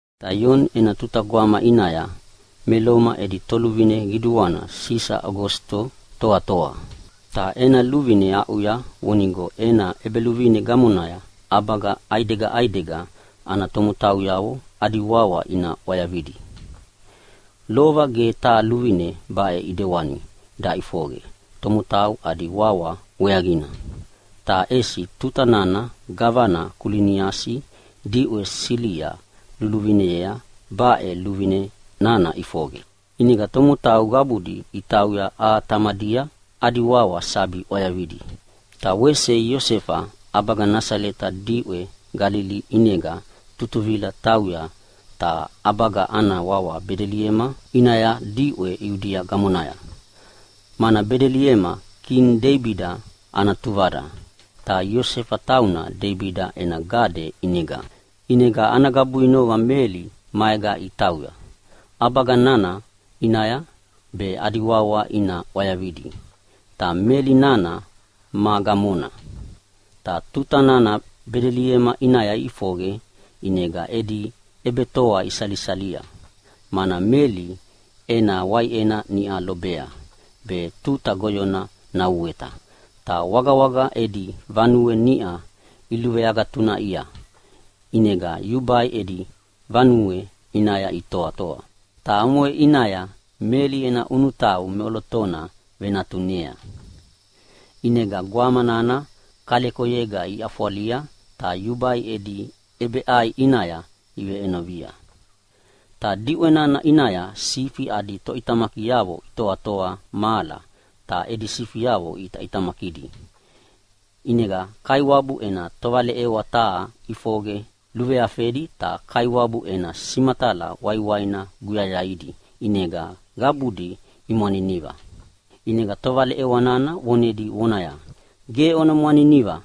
Ta Ioni ena tuta gwama ʼinaya me Loma edi toluvine qiduana Sisa Ogosito toatoa, ta ena luvine aʼuya vonigo ena ʼebeluvine gamonaya ʼabaga ʼaidega ʼaidega ana tomotauyavo adi wawayavo ina ʼwayavidi. Lova ge taha luvine baʼe ʼedewani daʼifoqe tomotau adi wawa weaqina, ta ʼesi tuta nana gavana Kuliniasi diʼwe Silia luluvinea baʼe luvine nana ʼifoqe. ʼInega tomotau qabudi itauya aha tamadia adi wawa sabi ʼwayavidi. Ta wese Iosefa ʼabaga Nasaleta diʼwe Galili ʼinega tutuvila tauya taha ʼabaga ana wawa Bedeliema ʼinaya diʼwe Iudia gamonaya, mana Bedeliema kini Deibida ana tuvada, ta Iosefa tauna Deibida ena gade ʼinega. ʼInega ana gabuinoqa Meli maega itauya ʼabaga nana ʼinaya be adi wawa ina ʼwayavidi, ta Meli nana ma gamona. Ta tuta nana Bedeliema ʼinaya iʼifoqe ʼinega edi ʼebetoa isalisalia, mana Meli ena waiʼena niʼa lobea, be tuta goyona nauweta. Ta wagawaga edi vanue niʼa iluveagatunaʼia, ʼinega yubai edi vanue ʼinaya itoatoa. Ta omoʼe ʼinaya Meli ena ʼunutau meʼolotona venatunea. ʼInega gwama nana kalekoyega iʼafwalia, ta yubai edi ʼebeʼai ʼinaya iveʼenovia. Ta diʼwe nana ʼinaya sifi adi toʼitamakiavo itoatoa mahala ta edi sifiavo iʼitaʼitamakidi. ʼInega Kaiwabu ena tovaleʼewa taha ʼifoqe luveafedi ta Kaiwabu ena simatala waiwaina guyayaidi ʼinega qabudi imwaniniva. ʼInega tovaleʼewa nana vonedi vonaya, “Ge ona mwaniniva,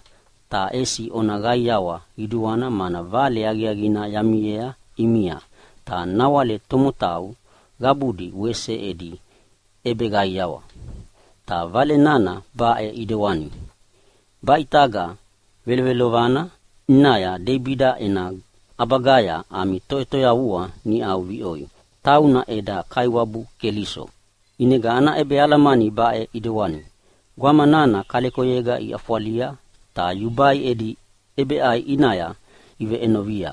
ta ʼesi ona qaiawa qiduana mana vale aqiaqina yamiea ʼimia, ta nawale tomotau qabudi wese edi ʼebeqaiawa. Ta vale nana baʼe ʼidewana, baʼe ʼitaga velovelovana ʼinaya Deibida ena ʼabagaya ami Toʼetoyavua niʼau viʼoi. Tauna eda Kaiwabu Keliso. ʼInega ana ʼebealamani baʼe ʼidewani, gwama nana kalekoyega iʼafwalia ta yubai edi ʼebeʼai ʼinaya iveʼenovia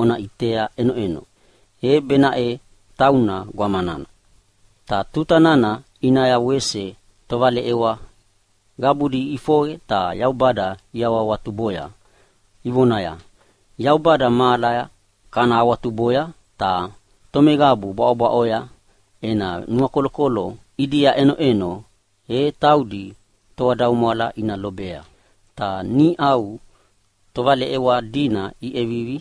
ona ʼitea ʼenoʼeno. E benaʼe tauna gwama nana.” Ta tuta nana ʼinaya wese tovaleʼewa qabudi iʼifoqe ta Yaubada iawahawatuboya, ivonaya, “Yaubada mahalaya kana awatuboya ta tomeqabu bwaʼobwaʼoya ena nuakolokolo ʼidia ʼenoʼeno e taudi toadaumwala ina lobea.” Ta niʼau tovaleʼewa dina iʼevivi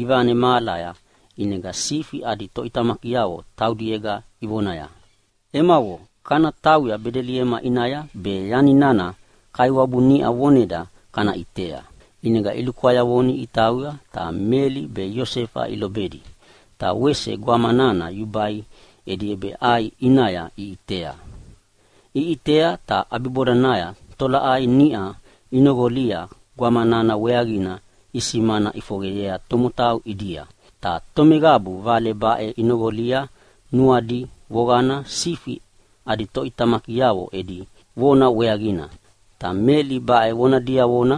ivane mahalaya, ʼinega sifi adi toʼitamakiavo taudiega ivonaya, “Emavo, kana tauya Bedeliema ʼinaya be yani nana Kaiwabu niʼa voneda kana ʼitea.” ʼInega ilukwayavoni itauya, ta Meli be Iosefa ilobedi, ta wese gwama nana yubai edi ʼebeʼai ʼinaya iʼitea. Iʼitea ta ʼabibodanaya tolaʼai niʼa inoqolia gwama nana weaqina isimana ʼifoqeyea tomotau ʼidia. Ta tomeqabu vale baʼe inoqolia nuadi voqana sifi adi toʼitamakiavo edi vona weaqina. Ta Meli baʼe vona diavona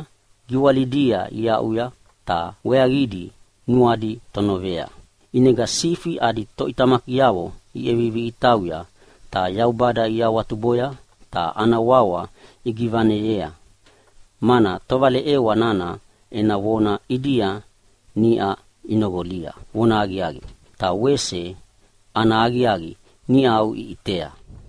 giwalidia iaʼuya, ta weaqidi nuadi tonovea. ʼInega sifi adi toʼitamakiavo iʼevivi itauya ta Yaubada iawatuboya ta ana wawa igivaneyea, mana tovaleʼewa nana ena vona ʼidia niʼa inoqolia vonahaqiaqi, ta wese ana aqiaqi niʼau iʼitea.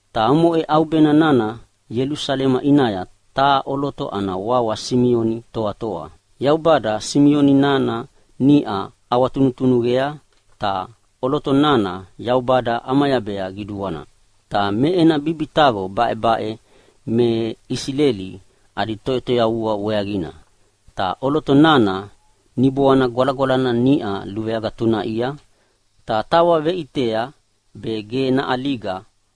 Ta omoʼe ʼaubena nana Ielusalema ʼinaya taha ʼoloto ana wawa Simioni toatoa. Yaubada Simioni nana niʼa ʼawatunutunuqea, ta ʼoloto nana Yaubada ʼamayabea qiduana. Ta me ena bibitaqo baʼebaʼe me Isileli adi Toʼetoyavua weaqina. Ta ʼoloto nana Niboana Gwalagwalana niʼa luveagatunaʼia, ta tawa veʼitea be ge naʼaliga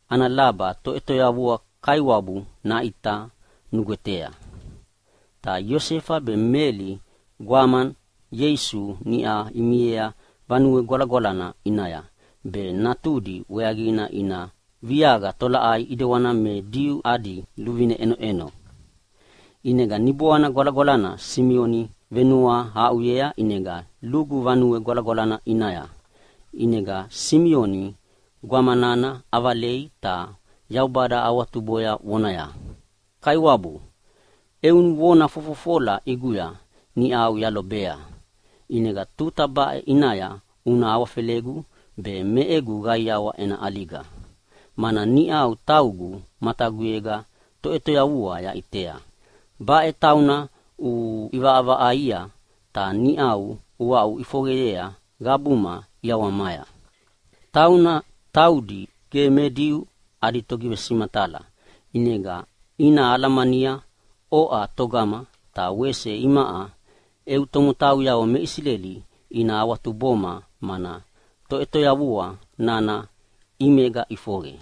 ana laba Toʼetoyavua Kaiwabu naʼita nugwetea. Ta Iosefa be Meli gwama Ieisu niʼau imiea Vanue Gwalagwalana ʼinaya be natudi weaqina ina viaqia tolaʼai ʼedewana me Diu adi luvine ʼenoʼeno. ʼInega Niboana Gwalagwalana Simioni venuahaʼuya ʼinega lugu Vanue Gwalagwalana ʼinaya. ʼInega Simioni gwama nana ʼavalei ta Yaubada awatuboya vonaya, “Kaiwabu, eu vona fofofola ʼiguya niʼau yalobea, ʼinega tuta baʼe ʼinaya una awafelegu be me egu qaiawa ena ʼaliga, mana niʼa taugu mataguyega Toʼetoyavua yaʼitea. Baʼe tauna uʼivaʼavaʼaia ta niʼau uaʼuʼifoqeyea qabuma ʼiawamaya. Tauna taudi ge me Diu adi togivesimatala ʼinega ina alamania oʼa togama, ta wese imaʼa eu tomotauyavo me Isileli ina awatuboma mana Toʼetoyavua nana ʼimega ʼifoqe.”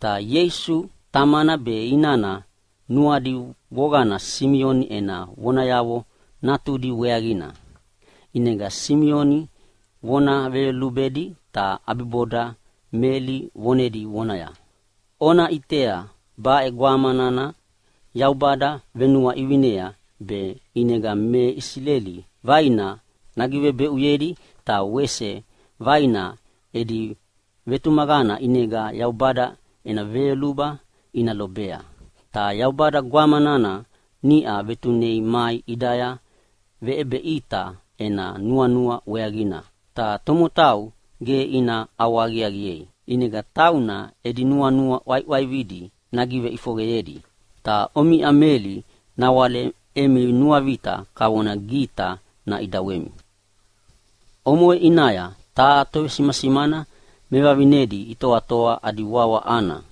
Ta Ieisu tamana be inana nuadi voqana Simioni ena vonayavo natudi weaqina. ʼInega Simioni vona veyolubedi ta ʼabiboda Meli vonedi vonaya, “Ona ʼitea, baʼe gwama nana Yaubada venuaʼivinea be ʼinega me Isileli vaina nagivebeʼuyedi, ta wese vaina edi vetumaqana ʼinega Yaubada ena veyoluba ina lobea. Ta Yaubada gwama nana niʼa vetunea mai ʼidaya naveʼebeʼita ena nuanua weaqina, ta tomotau ge ina ʼawahaqiaqiei. ʼInega tauna edi nuanua ʼwaiʼwaividi nagiveʼifoqeyedi. Ta omiʼa Meli nawale emi nuavita kavonaya gita naʼidawemi.” Omoʼe ʼinaya taha tovesimasimana mevavinedi itoatoa adi wawa Ana.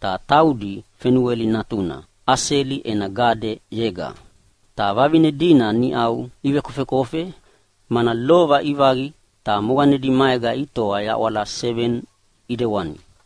Ta taudi Fanuela natuna, Aseli ena gadeyega. Ta vavine dina niʼau ivekofekofe, mana lova ivaqi ta moqanedi maega itoa yaʼwala seveni ʼidewana.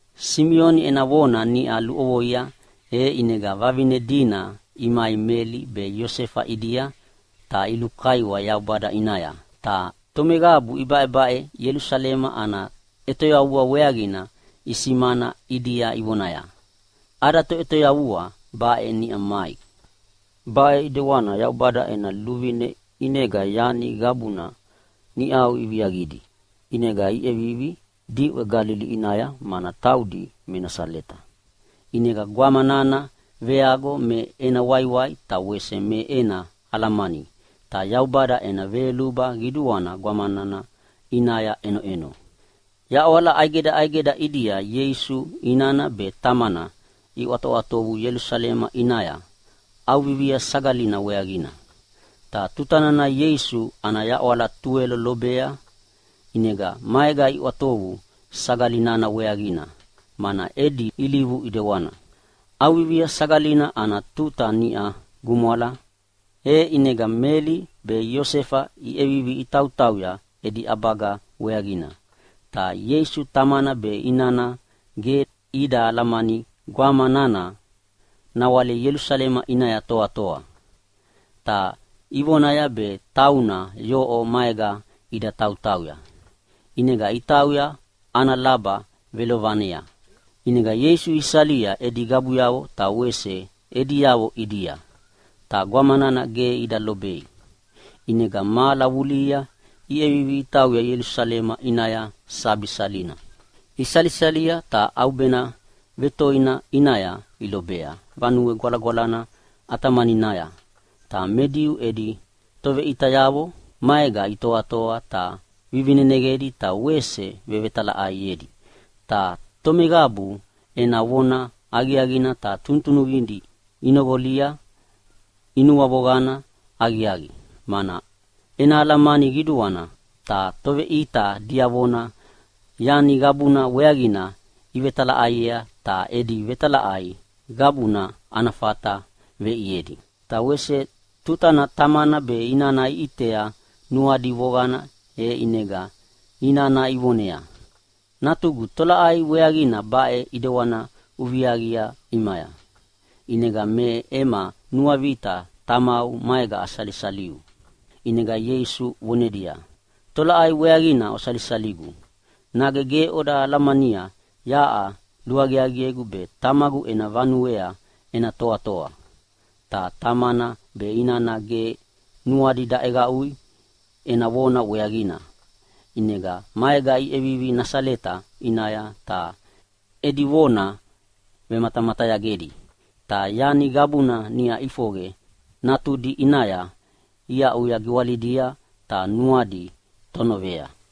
Simioni ena vona niʼa luʼovoia, e ʼinega vavine dina imai Meli be Iosefa ʼidia ta ilukaiwa Yaubada ʼinaya. Ta tomeqabu ibaʼebaʼe Ielusalema ana ʼetoyavua weaqina isimana ʼidia ivonaya, “Ada Toʼetoyavua baʼe niʼa mai!” Baʼe ʼidewana Yaubada ena luvine ʼinega yani qabuna niʼau iviaqidi. ʼInega iʼevivi diʼwe Galili ʼinaya mana taudi me Nasaleta. ʼInega gwama nana veago me ena waiwai ta wese me ena alamani, ta Yaubada ena veyoluba qiduana gwama nana ʼinaya ʼenoʼeno. Yaʼwala ʼaidega ʼaidega ʼidia Ieisu inana be tamana iʼwatoʼwatovu Ielusalema ʼinaya ʼAuvivia Sagalina weaqina. Ta tutana Ieisu ana yaʼwala tuwelo lobea, ʼinega maega iʼwatovu sagali nana weaqina, mana edi ilivu ʼedewana. ʼAuvivia Sagalina ana tuta niʼa gumwala, e ʼinega Meli be Iosefa iʼevivi itautauya edi ʼabaga weaqina. Ta Ieisu tamana be inana ge ida alamania gwama nana nawale Ielusalema ʼinaya toatoa, ta ivonaya be tauna yoʼo maega ida tautauya. ʼInega itauya ana laba velovanea, ʼinega Ieisu isalia edi qabuyavo ta wese ediavo ʼidia. Ta gwama nana ge ida lobei, ʼinega mahala vulihia iʼevivi itauya Ielusalema ʼinaya sabi salina. Isalisalia, ta ʼaubena vetoina ʼinaya ilobea Vanue Gwalagwalana ʼatamaninaya, ta me Diu edi toveʼitayavo maega itoatoa ta vivineneqedi be wese vevetalaʼaiedi. Ta tomeqabu ena vona aqiaqidi ta tunutunuqidi inoqolia inuavoqana aqiaqi, mana ena alamani qiduana. Ta toveʼita diavona yani qabuna weaqina ivetalaʼaiea, ta edi vetalaʼai qabuna ana fata veʼiedi. Ta wese tutana tamana be inana iʼitea nuadi voqana e ʼinega inana ivoneaya, “Natugu, tolaʼai weaqina baʼe ʼidewani uviaviaqi ʼimaya, ʼinega me ema nuavita tamau maega asalisaliu?” ʼInega Ieisu vonedia, “Tolaʼai weaqina osalisaligu? Nage ge oda alamania yaʼa luaqiaqiegu be Tamagu ena vanuea ena toatoa?” Ta tamana be inana ge nuadi daʼeqaʼui ena vona weaqina. ʼInega maega iʼevivi Nasaleta ʼinaya ta edi vona vematamatayagedi. Ta yani qabuna niʼa ʼifoqe natudi ʼinaya iaʼuya giwalidia ta nuadi tonovea.